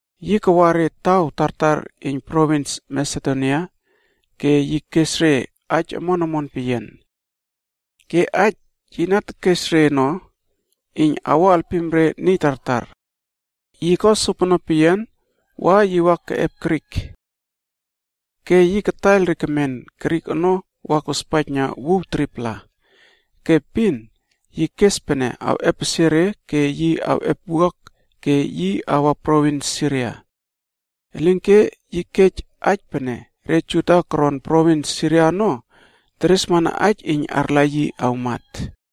Yi kawa re taw tartar iyn provins Masedonia ke yi kes re aij omon omon peyian. Ke aij yi na tekes re ono iyn awo alpim re niy tartar. Yi ko sopono peyian wa yi wa keꞌep kantri Grik. Ke yi kataiyl re kemen Grik ono wa kospaijna wuw 3-pla. Ke epin yi kes pene awꞌepesie re ke yi awꞌep wuak ke yi awa provins Siria. Elinke yi kej aij pene re Juda koron provins Siria ono, teresmana aij iyn arla yi awmat.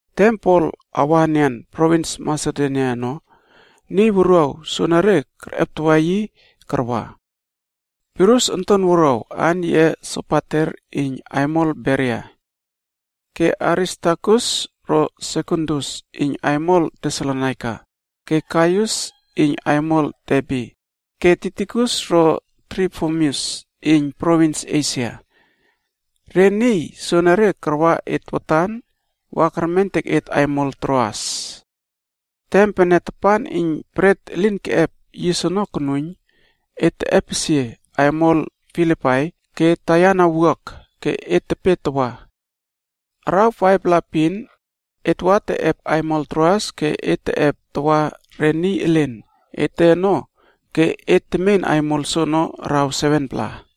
Tem Pol awa enian provins Masedonia ono, niy wuruaw soenere kerꞌeptawa yi karwa: Pirus onton wuruaw aan yiꞌe Sopater iyn aimol Beria. Ke Aristarkus ro Sekundus iyn aimol Tesalonaika, ke Gaius iyn aimol Derbe ke Tikikus ro Trofimus iyn provins Esia. Re niy soenere karwa et watan wa kermentek et aimol Troas. Tem pene tapan iyn Bret Elin Keꞌep Yis ono konuiyn, etb teꞌepesie aimol Filipai ke taiyana wuak ke et tepe tawa. Araw 5-pla epin et wa teꞌep aimol Troas ke et teꞌep tawa re niy elen ete ono ke et temen aimol soono araw 7-pla.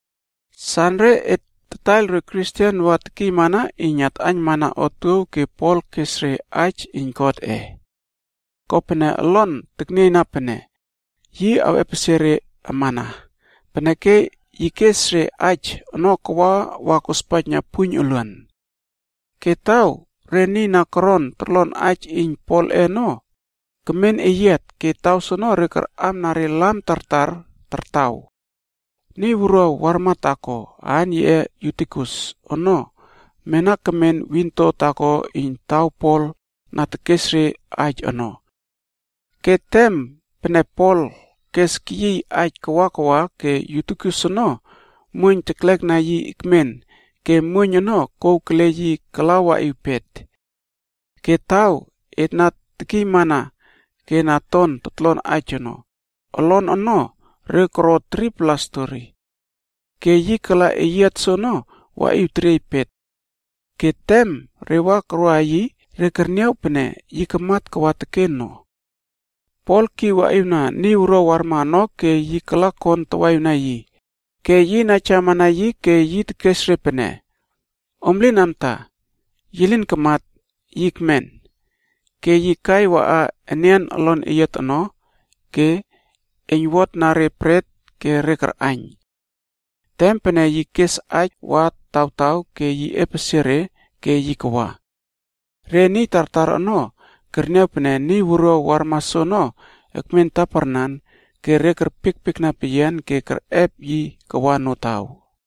Sanre et tataiyl re Kristen wa tekiymana iyn atꞌaiynmana otuow ke Pol kes re aij iyn Godꞌe. Kopene olon teknieyna pene yi awꞌepesie re amana, peneke yi kes re aij ono kawa wa kospaijna puiyn oluan. Ke taw re niy na koron torlon aij iyn Polꞌe ono kemen eyiat ke taw soono re karꞌamna re lam tartar tartaw. Niy wuruaw warma taako aan yiꞌe Yutikus ono mena kemen windo taako iyn taw Pol na tekes re aij ono. Ke tem pene Pol kes keyiy aij kawa kawa ke Yutikus ono muoiyn teklekna yi ekmen ke muoiyn ono kouw kele yi kala waꞌiw pet. Ke taw et na tekiymana ke na ton totlon aij ono, olon ono re koro 3-pla stori. Ke yi kala eyiat soono waꞌiw teriey pet. Ke tem re wa koroꞌa yi re kerniaw pene yi kamat kawa teken no. Pol kiw waꞌiwna niy wuruaw warma ono ke yi kala kon tawaꞌiwna yi, ke yi naijawama yi ke yi tekes re pene, “Om lin amta, yi lin kamat, yi ekmen.” Ke yi kai waꞌa enian olon eyiat ono ke eiynwotna re bret ke re karꞌaiyn. Tem pene yi kes aij wa tawtaw ke yi epesie re ke yi kawa. Re niy tartar ono kerniaw pene niy wuruaw warma soono ekmen taparnan ke re kerpiekpiekna peyian ke kerꞌep yi kawa notaw.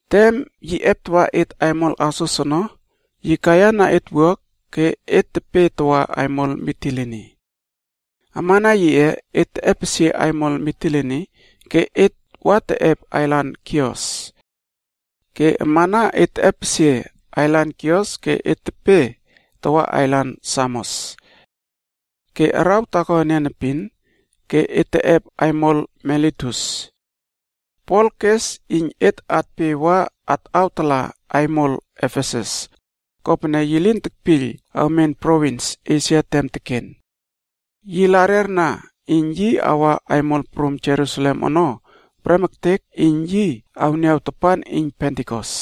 Tem yi eptawa et aimol Asos ono, yi kaiyana et wuak ke et tepe tawa aimol Mitilini. Amana yiꞌe, et teꞌepesie aimol Mitilini ke et wa teꞌep ailan Kios. Ke amana et teꞌepesie ailan Kios ke et tepe tawa ailan Samos. Ke araw taako enian epin ke et teꞌep aimol Miletus. Pol kes iyn et atpe wa atwatala aimol Efesus, kopene yi lin tekpiyl awmen provins Esia tem teken. Yi larerna iyn yi awa aimol prum Jerusalem ono prem ektek iyn yi awniaw tapan iyn Pentikos.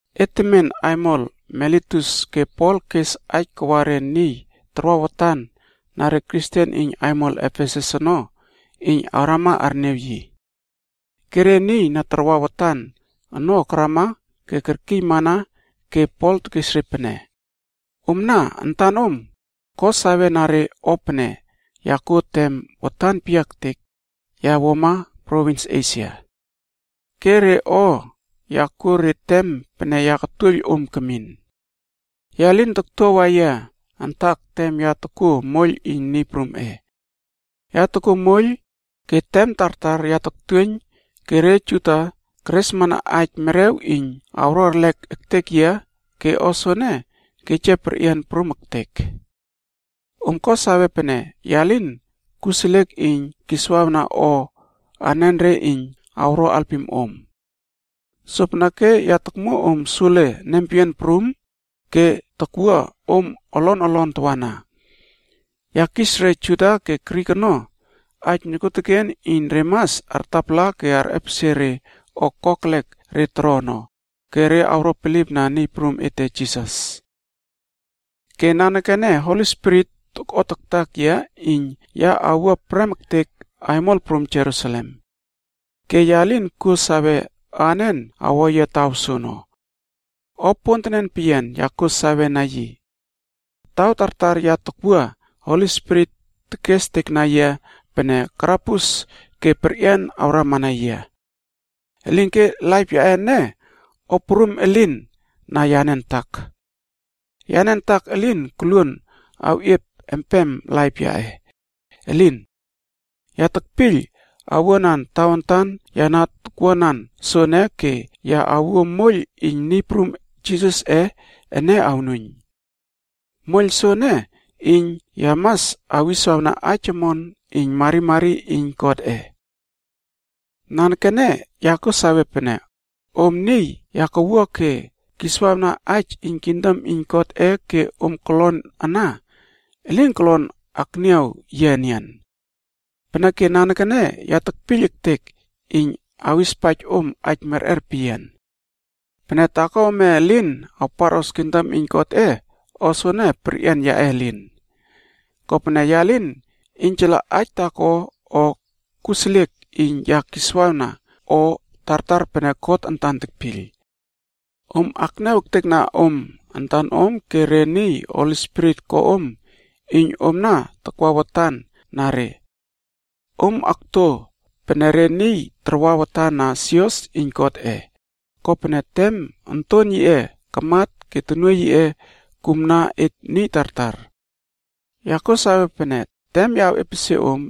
Et temen aimol Miletus ke Pol ono kes aij kawa re niy tarwa watan na re Kristen iyn aimol Efesus ono iyn awrama arniaw yi. Ke re niy na tarwa watan ono karama ke kerkiymana ke Pol tekes re pene, “Omna antanom ko sawena re o pene ya kuo tem watan peyiaektek ya wuama provins Esia. Ke re o ya kuo re tem pene ya katuoiyl om kemin. Ya lin toktuawa yia antak tem ya tokuo moiyl iyn Niy prumꞌe. Ya tokuo moiyl ke tem tartar ya toktuoiyn ke re Juda keresmana aij merew iyn awro erlek ektek yia ke o soene kej yia perꞌian prum ektek. Om ko sawe pene ya lin kuseliek iyn kiswawna o anenre iyn awro alpim om. Sopeneke ya tokmuo om sule nempeyian prum ke takwua om olon olon tawana. Tem tartar ya kis empema re Juda pe re Grik ono iyn re mas arꞌtapala ke arꞌepesie re o kokelek re toro ono ke artapalamana God ke awro bilipna Niy Prum ete Jisas ono. “Ke nanekene Holi Spirit tokꞌotaktak yia iyn ya awua prem ektek aimol prum Jerusalem. Ke ya lin kuo sawe anen awo yia taw soono. O pontenen peyian ya kuo sawena yi. Taw tartar ya takwua, Holi Spirit tekestekna yia pene karabus ke perꞌian awrama na yia. Elinke laip yaꞌe ene, o prum elin na yane antak. Yane antak elin koluon awꞌiep empem laip yaꞌe, elin! Ya tekpiyl owuanan tawantan ya na tokwuanan soene ke ya awuo moiyl iyn Niy Prum Jisasꞌe ene awnuiyn. Moiyl soene iyn ya mas awiswawna aij omon iyn marimari iyn Godꞌe. “Nanekene ya kuo sawe pene, om niy ya kawua ke kiswawna aij iyn kingdom iyn Godꞌe ke om kolon ana, elin kolon akniaw yia enian. Peneke nanekene ya tekpiyl ektek iyn awispaij om aij merꞌer peyian. Pene taako ome elin awparꞌos kingdom iyn Godꞌe, o soene perꞌian yaꞌe elin. Kopene ya lin iynjala aij taako o kuseliek iyn ya kiswawna o tartar pene God antan tekpiyl. Om akniaw ektekna om antanom ke re niy Holi Spirit ko om iyn om na takwa watan na re. Om akto pene re niy tarwa watan na sios iyn Godꞌe, kopene tem onton yiꞌe kamat ke tonuoiy yiꞌe kumna et niy tartar. Ya kuo sawe pene tem ya awꞌiepesie om,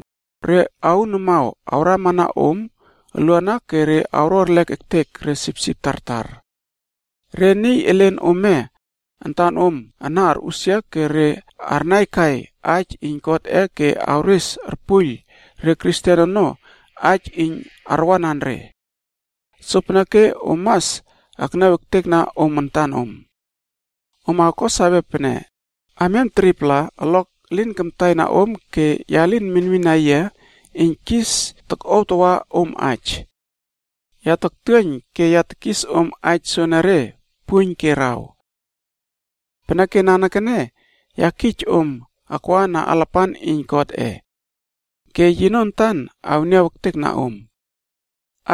re aun amaw awrama om oluana ke awro erlek ektek re sipsip tartar. Niy elen ome antanom ana arꞌusia ke re arnaikai aij iyn Godꞌe ke awres arpuiyl re Kristen ono aij iyn arwanan re. Sopeneke om mas akniaw ektekna om antanom. Om awko sawe pene amiam 3-pla, oluak elin kamtaina om ke ya lin minmina yia iyn kis tokꞌuaw tawa om aij. Ya toktuoiyn ke ya tekis om aij soonore puiyn ke araw. “Peneke nanekene ya kij om akwa na alapan iyn Godꞌe. Ke yino antan awniaw ektekna om.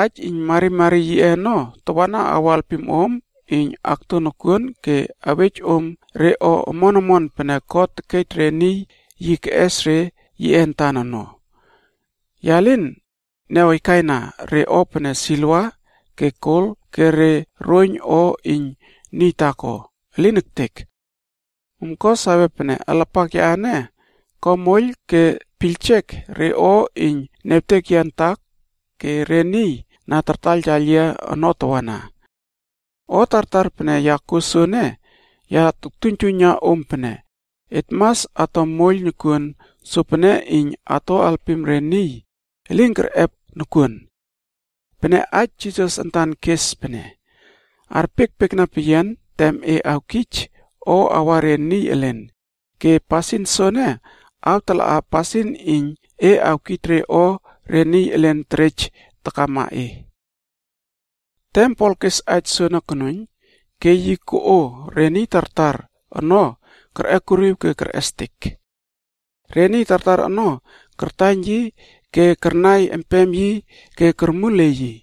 Aij iyn marimari yiꞌe ono tawana awo alpim om iyn akto nokuon ke awej om re o omon omon pene God tekej re niy yi keꞌes re yiꞌe antan ono. Ya lin niawkaina re o pene siliva, ke gol ke re roiyn o iyn niy taako. Elin ektek! Om ko sawe pene alapak yaꞌe ene, ko moiyl ke piyljek re o iyn niawtek yia antak ke re niy na tartaiyltaiyl yia ono tawana. O tartar pene ya kuo soene ya toktuiynjuiyna om pene, et mas ato moiyl nokuon sopene iyn ato alpim re niy elin kerꞌep nokuon. Pene aij Niy Prum Jisas antan kes pene: ‘Arpiekpiekna peyian tem e awkij o awa re niy elen, ke pasin soene awtalaꞌa pasin iyn e awkij re o re niy elen terej takama e.’” Tem Pol kes aij soene konuiyn, ke yi koꞌo re niy tartar ono kerꞌekuriw ke kerꞌestek. Re niy tartar ono kartaiyn yi ke karnai empem yi ke kormuliey yi.